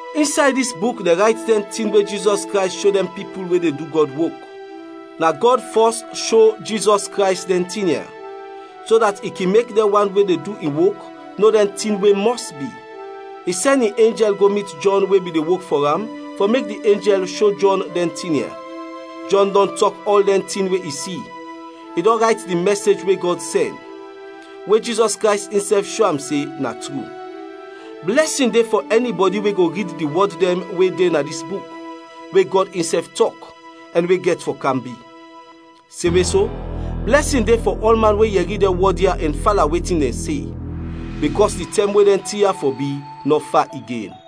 Insay dis buk dɛn rayt dɛn tin we Jizɔs Krays sho dɛn pipul we de du Gɔd wok. Na Gɔd fɔs sho Jizɔs Krays dɛn tin ya, so dat i kin mek dɛn wan we de du in wok no dɛn tin we mɔs bi. I sɛn in enjɛl go mit Jɔn we bin de wok fɔ am fɔ mek di enjɛl sho Jɔn dɛn tin ya. Jɔn dɔn tɔk ɔl dɛn tin we i si; i dɔn rayt di mɛsej we Gɔd sɛn, we Jizɔs Krays insɛf sho am se na tru. Blɛsin de fɔ ɛnibɔdi we go rid di wɔd dɛn we de na dis buk, we Gɔd insɛf tɔk, ɛn we gɛt fɔ kam bi. Semwe so, blɛsin de fɔ ɔlman we yɛri dɛn wɔd ya ɛn fala wetin dɛn se, bikɔs di tɛm we dɛn tin ya fɔ bi, nɔ fa igen.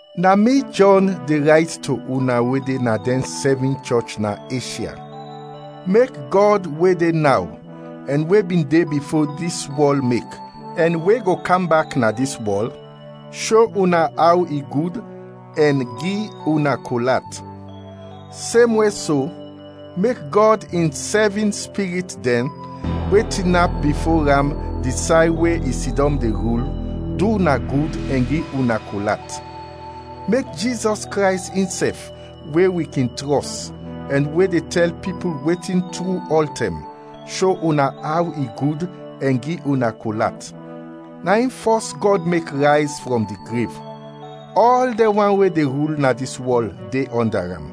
Na mi Jɔn de rayt to una we de na dɛn sɛvin chɔch na Eshya. Mek Gɔd we de naw, ɛn we bin de bifo dis wɔl mek, ɛn we go kam bak na dis wɔl, sho una aw i gud ɛn gi una kol at; semwe so, mek Gɔd in sɛvin spirit dɛn, we tinap bifo am di say we i sidɔm de rul, du una gud ɛn gi una kol at; mek Jizɔs Krays insɛf, we wi kin trɔs, ɛn we de tɛl pipul wetin tru ɔltɛm, sho una aw i gud ɛn gi una kol at. Na in fɔs Gɔd mek rayz frɔm di grev. Ɔl dɛn wan we de rul na dis wɔl de ɔnda am.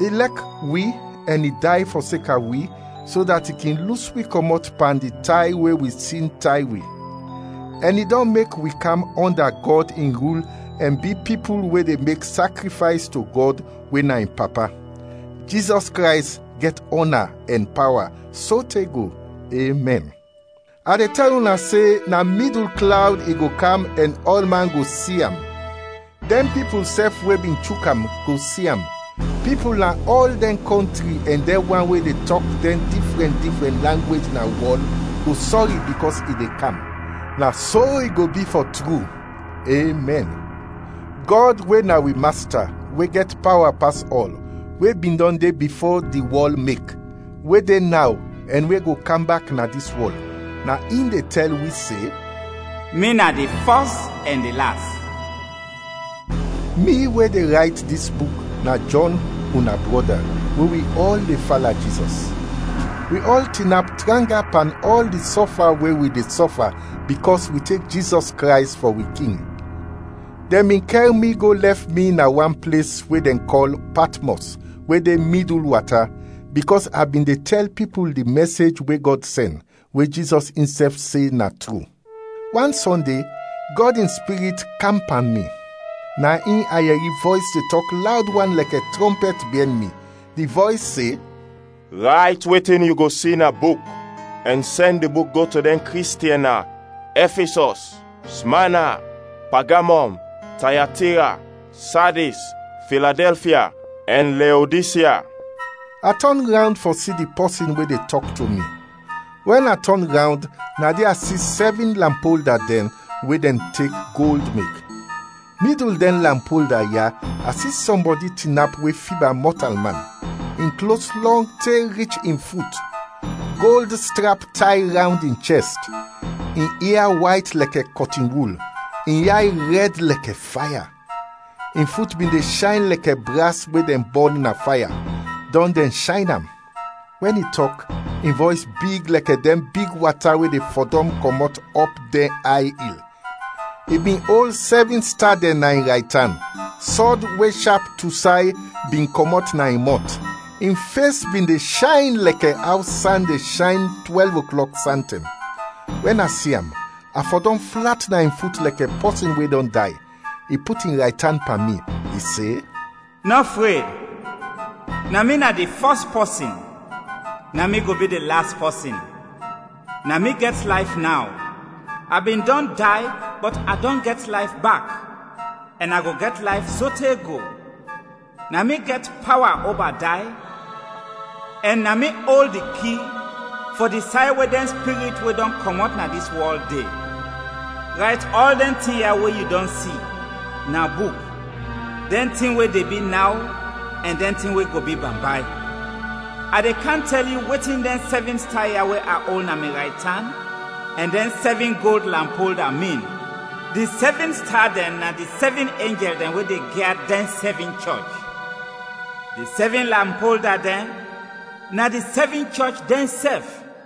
I lɛk wi ɛn i day fɔseka wi so dat i kin lus wi kɔmɔt pan di tay we wi sin tay wi, ɛn i dɔn mek wi kam ɔnda Gɔd in rul ɛn bi pipul we de mek sakrifays to Gɔd we na in Papa. Jizɔs Krays gɛt ɔna ɛn pawa sote go. Emɛn. A de tɛl una se na midul klawd i go kam ɛn ɔlman go si am; dɛn pipul sɛf we bin chuk am go si am; pipul na ɔl dɛn kɔntri ɛn dɛn wan we de tɔk dɛn difrɛn difrɛn langwej na wɔl go sɔri bikɔs i de kam. Na so i go bi fɔ tru! Emɛn. Gɔd we na wi Masta we gɛt pawa pas ɔl, we bin dɔn de bifo di wɔl mek, we de naw ɛn we go kam bak na dis wɔl, na in de tɛl wi se “Mi na di Fɔs ɛn di Las.” Mi we de rayt dis buk na Jɔn, una brɔda, we wi ɔl de fala Jizɔs. Wi ɔl tinap tranga pan ɔl di sɔfa we wi de sɔfa bikɔs wi tek Jizɔs Krays fɔ wi King. Dɛn bin kɛr mi go lɛf mi na wan ples we dɛn kɔl Patmɔs we de midul wata, bikɔs a bin de tɛl pipul di mɛsej we Gɔd sɛn, we Jizɔs insɛf se na tru. Wan Sɔnde, Gɔd in Spirit kam pan mi, na in a yɛri vɔys de tɔk lawd wan lɛkɛ trɔmpɛt biɛn mi. Di vɔys se, “Rayt wetin yu go si na buk ɛn sɛn di buk go to dɛn Kristiɛn na: Ɛfisɔs, Smana, Pagamɔm, Tayatira, Sadis, Filadɛlfia, ɛn Leodisya.” A tɔn rawnd fɔ si di pɔsin we de tɔk to mi. Wɛn a tɔn rawnd na de a si sɛvin lampolda dɛn we dɛn tek gold mek. Midul dɛn lampolda ya a si sɔmbɔdi tinap we fiba mɔtalman. In klos lɔng te rich in fut, gold strap tay rawnd in chɛst. In ia wayt lɛkɛ kɔtinwul, in yay rɛd lɛkɛ faya; in fut bin de shayn lɛkɛ bras we dɛn bɔn na faya, dɔn dɛn shayn am; wɛn i tɔk, in vɔys big lɛkɛ dɛn big wata we de fɔdɔm kɔmɔt ɔp dɛn ay il. I bin ol sɛvin sta dɛn na in raytan; sɔd we shap tu say bin kɔmɔt na in mɔt; in fes bin de shayn lɛkɛ aw san de shayn twɛlv oklɔk santɛm. Wɛn a si am, a fɔdɔm flat na in fut lɛkɛ pɔsin we dɔn day. I put in raytan pan mi, i se, “Nɔ fred. Na mi na di fɔs pɔsin, na mi go bi di las pɔsin. Na mi gɛt layf naw. A bin dɔn day bɔt a dɔn gɛt layf bak, ɛn a go gɛt layf sote go; na mi gɛt pawa oba day ɛn na mi ol di ki fɔ di say we dɛn spirit we dɔn kɔmɔt na dis wɔl de. Rayt ɔl dɛn tin ya we yu dɔn si na buk dɛn tin we de bi naw ɛn dɛn tin we go bi bambay. A de kam tɛl yu wetin dɛn sɛvin sta ya we a ol na mi raytan ɛn dɛn sɛvin gold lampolda, min; di sɛvin sta dɛn na di sɛvin enjɛl dɛn we de gyad dɛn sɛvin chɔch. Di sɛvin lampolda dɛn na di sɛvin chɔch dɛnsɛf.”